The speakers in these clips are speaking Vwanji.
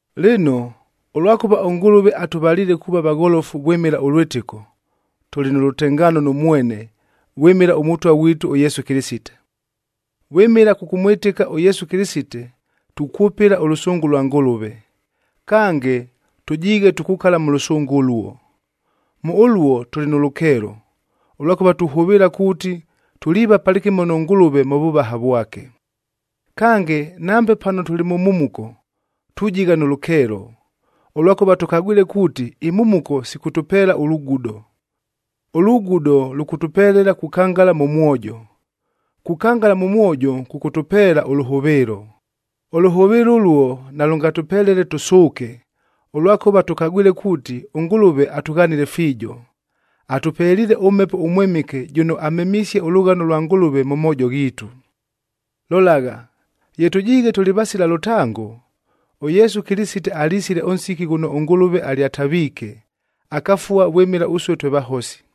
Lɨno, ʉlwakʉva ʉNgʉlʉve atʉvaliile kuuva vagholofu vwɨmɨla ʉlwɨtɨko, tʉlɨ nʉ lʉtengaano nʉ mwene vwɨmɨla ʉMʉtwa ghwitu ʉYesu Kɨlɨsite. Vwɨmɨla kʉkʉmwɨtɨka ʉYesu Kɨlɨsite, tukwʉpɨla ʉlʉsʉngʉ lwa Ngʉlʉve, kange tʉjiighe tukukala mʉ lʉsʉngʉ ʉluo. Mʉ ʉluo tʉlɨ nʉ lʉkeelo, ʉlwakʉva tuhʉvɨɨla kuuti tuliiva palɨkɨmo nʉ Ngʉlʉve mʉ vʉvaha vwake. Kange, nambe pano tʉlɨ mʉ mhumuko, tujigha nʉ lʉkeelo, ʉlwakʉva tʉkagwile kuuti imhumuko sikʉtʉpeela ʉlugudo. Ʉlugudo lʉkʉtʉpelela kukangala mʉ mwojo; kukangala mʉ mwojo, kʉkʉtʉpeela ʉlʉhʉvɨɨlo. Ʉlʉhʉvɨɨlo ʉluo nalʉngatʉpelele tʉsʉʉke, ʉlwakʉva tʉkagwile kuuti ʉNgʉlʉve atʉghanile fiijo. Atʉpeliile ʉMhepo ʉMwɨmɨke jʉno amemisie ʉlʉghano lwa Ngʉlʉve mʉ moojo ghiitu. Lolagha, ye tʉjiighe tʉlɨ vasila lʉtango, ʉYesu Kɨlɨsite alisile ʉnsiki ghʉno ʉNgʉlʉve alyataviike, akafua vwɨmɨla ʉsue twe vahosi.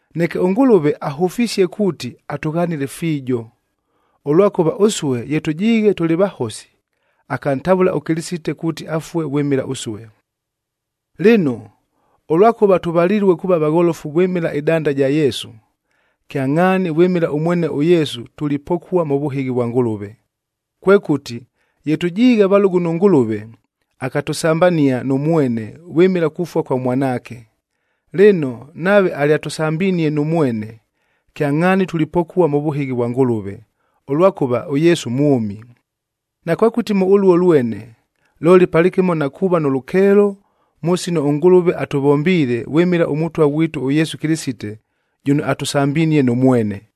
Neke ʉNgʉlʉve ahʉfisie kuuti atʉghanile fiijo, ʉlwakʉva ʉsue ye tʉjiighe tʉlɨ vahosi, akantavʉla ʉKɨlɨsite kuuti afue vwɨmɨla ʉsue. Lɨno, ʉlwakʉva tʉvalilue kuuva vagholofu vwɨmɨla ɨdanda ɨja Yesu, kyangʼhaani vwɨmɨla ʉmwene ʉYesu tulipokua mʉ vʉhɨghi vwa Ngʉlʉve. Kwekʉti, ye tʉjiighe valʉgʉ nʉ Ngʉlʉve, akatʉsambania nʉ mwene vwɨmɨla kufua kwa Mwanaake. Lɨno, nave alyatʉsambinie nʉ mwene, kyangʼhaani tulipokua mʉ vʉhɨghi vwa Ngʉlʉve, ʉlwakʉva ʉYesu mwʉmi. Nakwekʉti mʉ ʉluo lwene, looli palɨkɨmo na kuuva nʉ lʉkeelo mʉ sino ʉNgʉlʉve atʉvombiile vwɨmɨla ʉMʉtwa ghwitu ʉYesu Kɨlɨsite jʉno atʉsambinie nʉ mwene.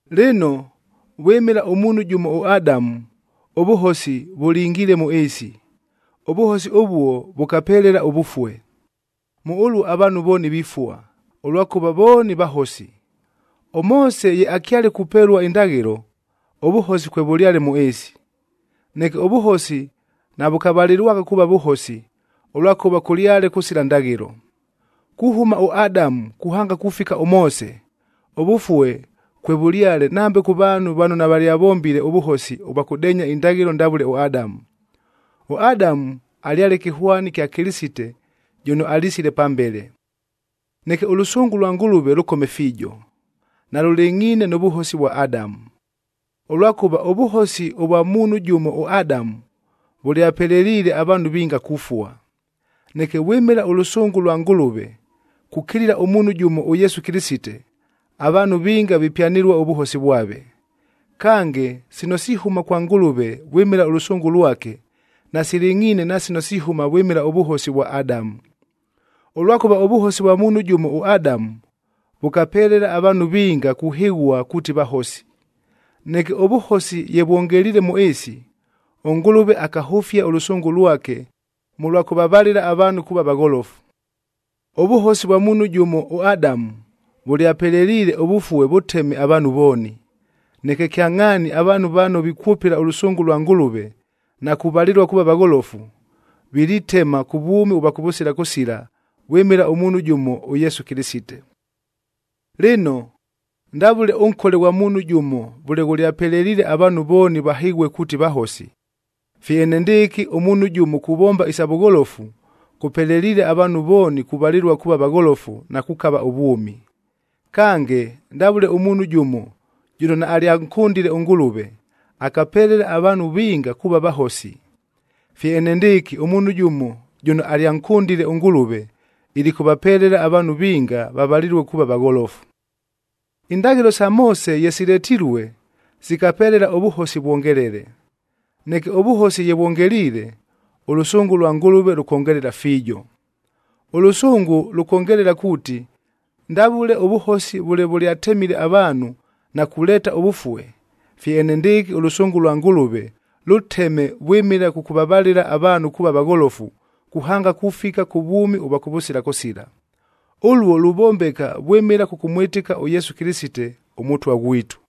Lɨno, vwɨmɨla ʉmuunhu jʉmo ʉAdamu, ʉvʉhosi vʉlingiile mʉ ɨɨsi. Ʉvʉhosi ʉvuo vʉkapelela ʉvʉfue. Mʉ ʉluo avaanhu vooni vifua, ʉlwakʉva vooni vahosi. ɄMoose ye akyale kupelua indaghɨlo, ʉvʉhosi kwevʉlyale mʉ ɨɨsi. Neke ʉvʉhosi navʉkavalɨlwagha kuuva vʉhosi, ʉlwakʉva kʉlyale kʉsila ndaghɨlo. Kuhʉma ʉAdamu kuhanga kufika ʉMoose, ʉvʉfue kwevʉlyale nambe kʉ vaanhu vano navalyavombile ʉvʉhosi ʉvwa kʉdeenya indaghɨlo ndavʉle ʉAdamu. ɄAdamu alyale kɨhwani kya Kɨlɨsite jʉno alisile pambele. Neke ʉlʉsʉngʉ lwa Ngʉlʉve lʉkome fiijo, nalʉlɨngʼhiine nʉ vʉhosi vwa Adamu! Ʉlwakʉva ʉvʉhosi ʉvwa muunhu jʉmo ʉAdamu, vʉlyapeleliile avaanhu vinga kufua. Neke vwɨmɨla ʉlʉsʉngʉ lwa Ngʉlʉve kukilila ʉmuunhu jʉmo ʉYesu Kɨlɨsite, avaanhu vinga vipyanɨlua ʉvʉhosi vwave. Kange, sino sihʉma kwa Ngʉlʉve vwɨmɨla ʉlʉsʉngʉ lwake, nasilɨngʼhiine na sino sihʉma vwɨmɨla ʉvʉhosi vwa Adamu. Ʉlwakʉva ʉvʉhosi vwa muunhu jʉmo ʉAdamu, vʉkapelela avaanhu vinga kuhɨghua kuuti vahosi. Neke ʉvʉhosi ye vwongeliile mʉ ɨɨsi, ʉNgʉlʉve akahʉfia ʉlʉsʉngʉ lwake mʉlwa kʉvavalɨla avaanhu kuuva vagholofu. Ʉvʉhosi vwa muunhu jʉmo ʉAdamu, vʉlyapeleliile ʉvʉfue vʉteme avaanhu vooni. Neke kyangʼhaani avaanhu vano vikwʉpɨla ʉlʉsʉngʉ lwa Ngʉlʉve na kuvalɨlua kuuva vagholofu, vilitema kʉ vwʉmi ʉvwa kʉvʉsila kʉsila vwɨmɨla ʉmuunhu jʉmo ʉYesu Kɨlɨsite. Lɨno, ndavʉle ʉnkole ghwa muunhu jʉmo vʉle ghʉlyapeleliile avaanhu vooni vahɨghue kuuti vahosi, fye enendɨɨkɨ ʉmuunhu jʉmo kuvomba isa vʉgholofu kʉpeleliile avaanhu vooni kuvalɨlua kuuva vagholofu na kukava ʉvwʉmi. Kange, ndavʉle ʉmuunhu jʉmo jʉno naalyankʉndile ʉNgʉlʉve, akapelela avaanhu vinga kuuva vahosi, fye enendɨɨkɨ ʉmuunhu jʉmo jʉno alyankʉndile ʉNgʉlʉve ilikʉvapelela avaanhu vinga vavalɨlue kuuva vagholofu. Indaghɨlo sa Moose ye siletilue, sikapelela ʉvʉhosi vwongelele. Neke ʉvʉhosi ye vwongeliile, ʉlʉsʉngʉ lwa Ngʉlʉve lʉkongelela fiijo. Ʉlʉsʉngʉ lʉkongelela kuuti, ndavʉle ʉvʉhosi vʉle vʉlyatemile avaanhu na kuleeta ʉvʉfue, fye enendɨɨkɨ ʉlʉsʉngʉ lwa Ngʉlʉve lʉteme vwɨmɨla kʉkʉvavalɨla avaanhu kuuva vagholofu kuhanga kufika kʉ vwʉmi ʉvwa kʉvʉsila kʉsila. Ʉluo luvombeka vwɨmɨla kʉkʉmwɨtɨka ʉYesu Kɨlɨsite, ʉMʉtwa ghwitu.